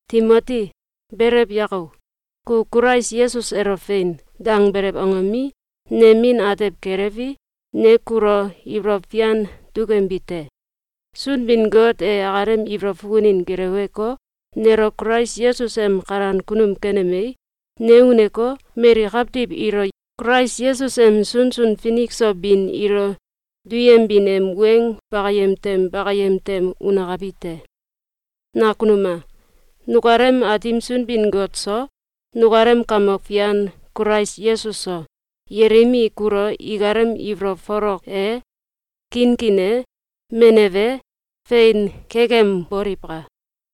Timoti, belew yako! Ku Kulais Yesus elo “Fein!”, dangbelew angomi, nem min atew kelewi, ne kulo ibolow fian dukembi te. Sunbin-Got e akalem ibolow fukunin geleweko, nelo Kulais Yesus em kalan kunum kenemei, ne uneko, mali kawtiw ilo Kulais Yesus em sunsun finik so bin ilo duyembin em weng bakayem tem bakayem tem unakabi te. Nakanum a! Nukalem Aatim Sunbin-Got so, nukalem Kamok Fian Kulais Yesus so, yelim i kulo ikalem ibolow folok e, kinkin e, menew e, fein kekemboliwka!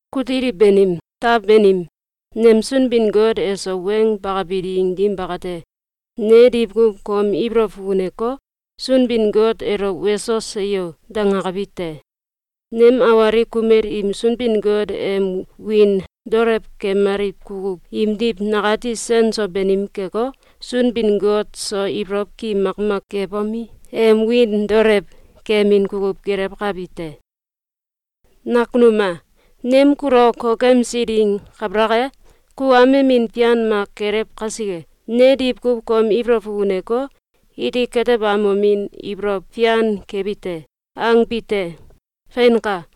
Kutiliw banim, taw banim, nem Sunbin-Got eso weng bakabi ding dim bakate, ne diwkuw kom ibolow fukuneko, Sunbin-Got elo “Weso! Seyo!”, dangakabi te. Nem awalik kumel im Sunbin-Got em em wiin daolewkemaliw kukuw imdiw nakati sen so banim keko, Sunbin-Got so ibolow ki makmak kebomi, em wiin daolew kemin kukuw gelewkabi te. Nakunum a! Nem kulo kokemsi ding kabalak e, ku amemin fian mak kelew kasike, ne diwkuw kom ibolow fukuneko, “Iti katebamomin ibolow fian kebi te!”, angbi te. Feinka!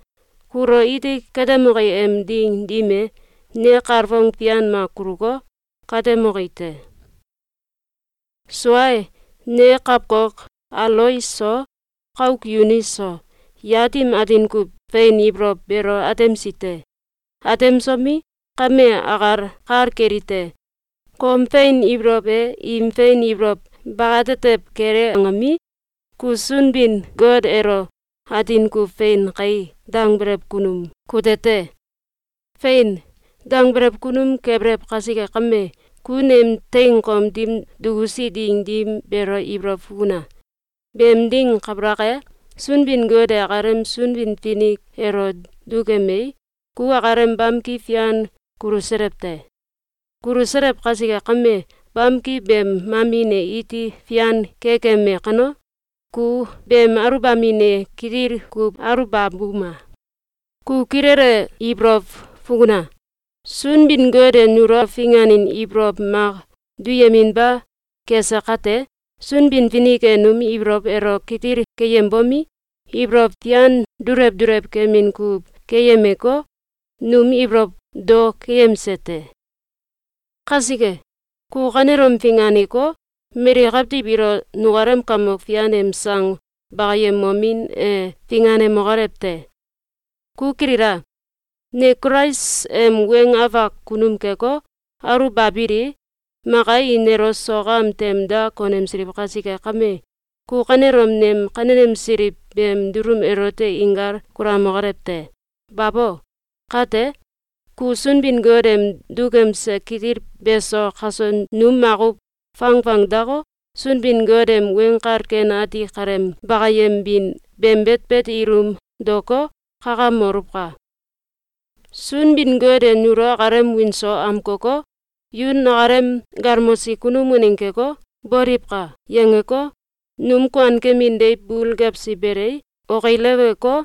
Kulo iti katemoki em ding dim e, ne kalfong fian mak kuluko, katemoki te. Sua e, ne kawkok Alois so, kauk Yunis so, yat im atin kuw fein ibolow beelo atemsi te. Atemsomi, kame akal kal kelite: Kom fein ibolow e im fein ibolow bakate tew kele angomi, ku Sunbin-Got elo atin kuw “Fein kae!”, dangbelew kunum kute te. “Fein!”, dangbelew kunum kebelew kasike kame, ku nem teing kom dim dukusi ding dim beelo ibolow fukuna! Beem ding kabalak e, Sunbin-Got e akalem Sunbin-Finik elo dukemei, ku akalem bamki fian kuluselew te. Kuluselew kasike kame, bamki beem mamin e iti fian kekeme kano, ku beem aluwbamin e kitil kuw aluwbabuma! Ku kilele ibolow fukuna! Sunbin-Got e nulo finganin ibolow mak duyeminba kese kate, Sunbin-Finik e num ibolow elo kitil keyembomi, ibolow fian dulew dulew kemin kukuw keyemeko, num ibolow tou keyemse te. Kasike, ku kanelom finganeko, mali kawtiw ilo nukalem Kamok Fian em sang bakayembomin e finganemokolew te! Ku kilila! Ne Kulais em weng afak kunum keko, aluwbabilii, maka i nelo sok am tem da konemsiliw kasike kame, ku kanelom nem kanenemsiliw beem dulum elote inkal kulamokolew te! Babo! Kate, ku Sunbin-Got em dukemse kitil beso kaso nu makuw fangfang dako, Sunbin-Got em Weng Kal Ken Ati kaleem bakayembin beem betbet ilum daoko, kakamoluwka! Sunbin-Got e nulo akalem wiin so amkoko, “Yu nakalem galmosi kunum waneng keko, boliwka!”, yangeko, num kuankemin deiw bul gewsi belei, okileweko,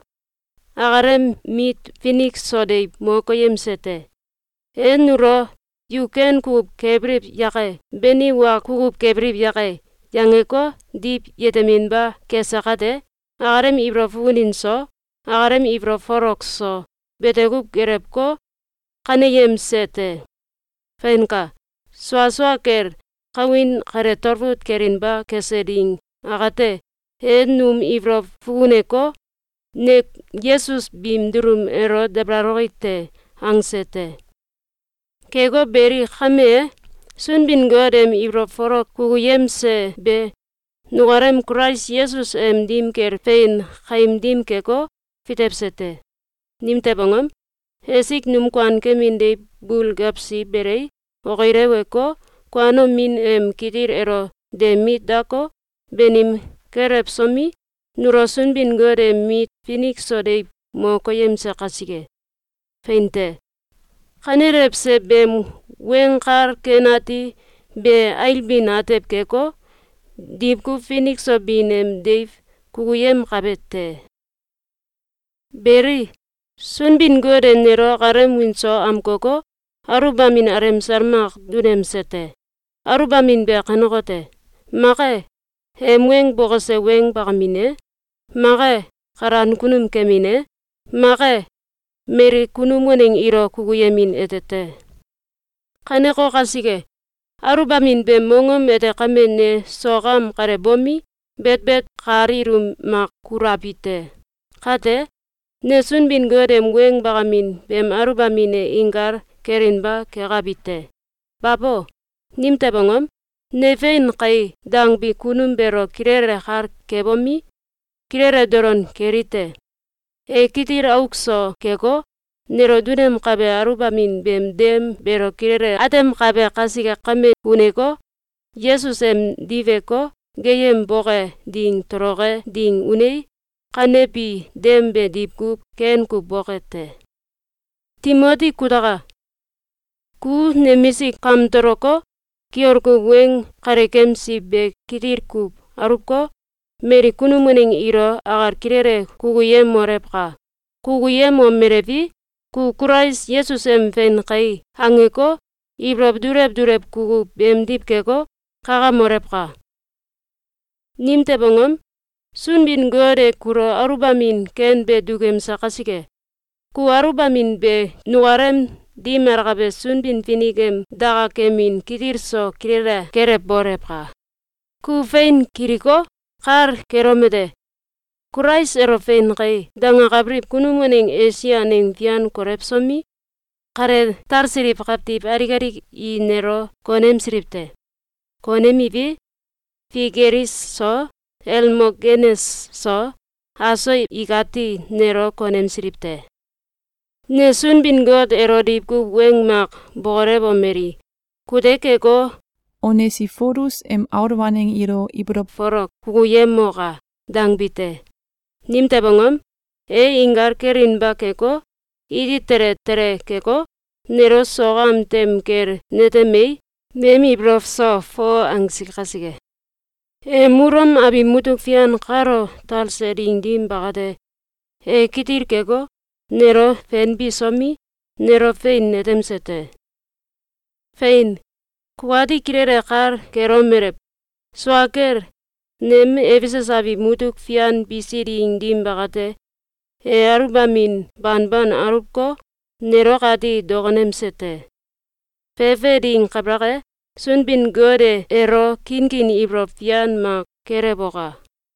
akalem mit finik so deiw mo koyemse te. E nulo “Yu ken kukuw kebiliw yake!”, beni “Wa kukuw kebiliw yake!”, yangeko, diw yeteminba kese kate, akalem ibolow fukunin so, akalem ibolow folok so, bete kuw gelewko, kaneyemse te. Feinka! Sua sua kel, kawin kale talfut kelinba kese ding akate, e num ibolow fukuneko, “Ne Yesus biim dulum elo dabalaloki te!”, angse te. Keko beli, kame e, Sunbin-Got em ibolow folok kukuyemse be, nukalem Kulais Yesus em dim kel fein kaim dim keko, fitewse te. Nimtew angom? Esik num kuankemin deiw bul gewsi belei, okileweko, kuanomin em kitil elo de mit dako, banim kelewsomi, nulo Sunbin-Got em mit finik so deiw mo koyemse kasike. Fein te! Kanelewse beem Weng Kal Ken Ati be ailbin atew keko, diwkuw finik so bin em deiw kukuyemkabe te. Beli, Sunbin-Got e nelo akalem wiin so amkoko, aluwbamin alemsal mak dunemse te. Aluwbamin be kanekote: Mak e, em weng bokose weng bakamin e, mak e, kalan kunum kemin e, mak e, mali kunum waneng ilo kukuyemin ete te. Kaneko kasike, aluwbamin beem mongom ete kame ne sok am kale bomi, betbet kal ilum mak kulabi te. Kate, ne Sunbin-Got em weng bakamin beem aluwbamin e inkal kelinba kekabi te. Babo! Nimtew angom? Ne “Fein kai!”, dangbi kunum beelo kilele kal kebomi, kilele dolon kelite: E kitil auk so keko, nelo dunemkabe aluwbamin beem dem beelo kilele atemkabe kasike kame uneko, Yesus em diweko, geeyemboke ding toloke ding unei, kanebi dem be diwkuw ken kuw boke te. Timoti kutaka! Ku nemisik kamtoloko, kiol kuw weng kalekemsi be kitil kuw aluwko, mali kunum waneng ilo akal kilele kukuyemolewka! Kukuyemomelewi, ku Kulais Yesus em “Fein kai!”, angeko, ibolow dulew dulew kukuw beemdiw keko, kakamolewka! Nimtew angom? Sunbin-Got e kulo aluwbamin ken be dukemse kasike, ku aluwbamin be nukalem dim alakabe Sunbin-Finik em dakakemin kitil so kilele kelewbolewka! Ku fein kiliko, kal kelomete: Kulais elo “Fein kai!”, dangakabiliw kunum waneng Esia aneng fian kolewsomi, kale talsiliw kawtiw alik alik i nelo konemsiliw te. Konemiwi, Figelis so, Elmogenes so, aso ikati nelo konemsiliw te. Ne Sunbin-Got elo diwkuw weng mak bokolewomeli: “Kute keko, Onesifolus em aul waneng ilo ibolow folok kukuyemoka!”, dangbi te. Nimtew angom? E inkal kelinba keko, iti tele tele keko, nelo sok am tem kel netemei, nem ibolow so foo angsi kasike. Em Ulom abiw mutuk fian kalo talse ding dim bakate, e kitil keko, nelo fenbisomi, nelo fein netemse te. Fein, kukati kilele kal kelomelew: Sua kel, nem Efesus abiw mutuk fian bisi ding dim bakate, e aluwbamin banban aluwko, nelo akati dokonemse te. Fefe ding kabalak e, Sunbin-Got e elo kinkin ibolow fian mak kelewoka!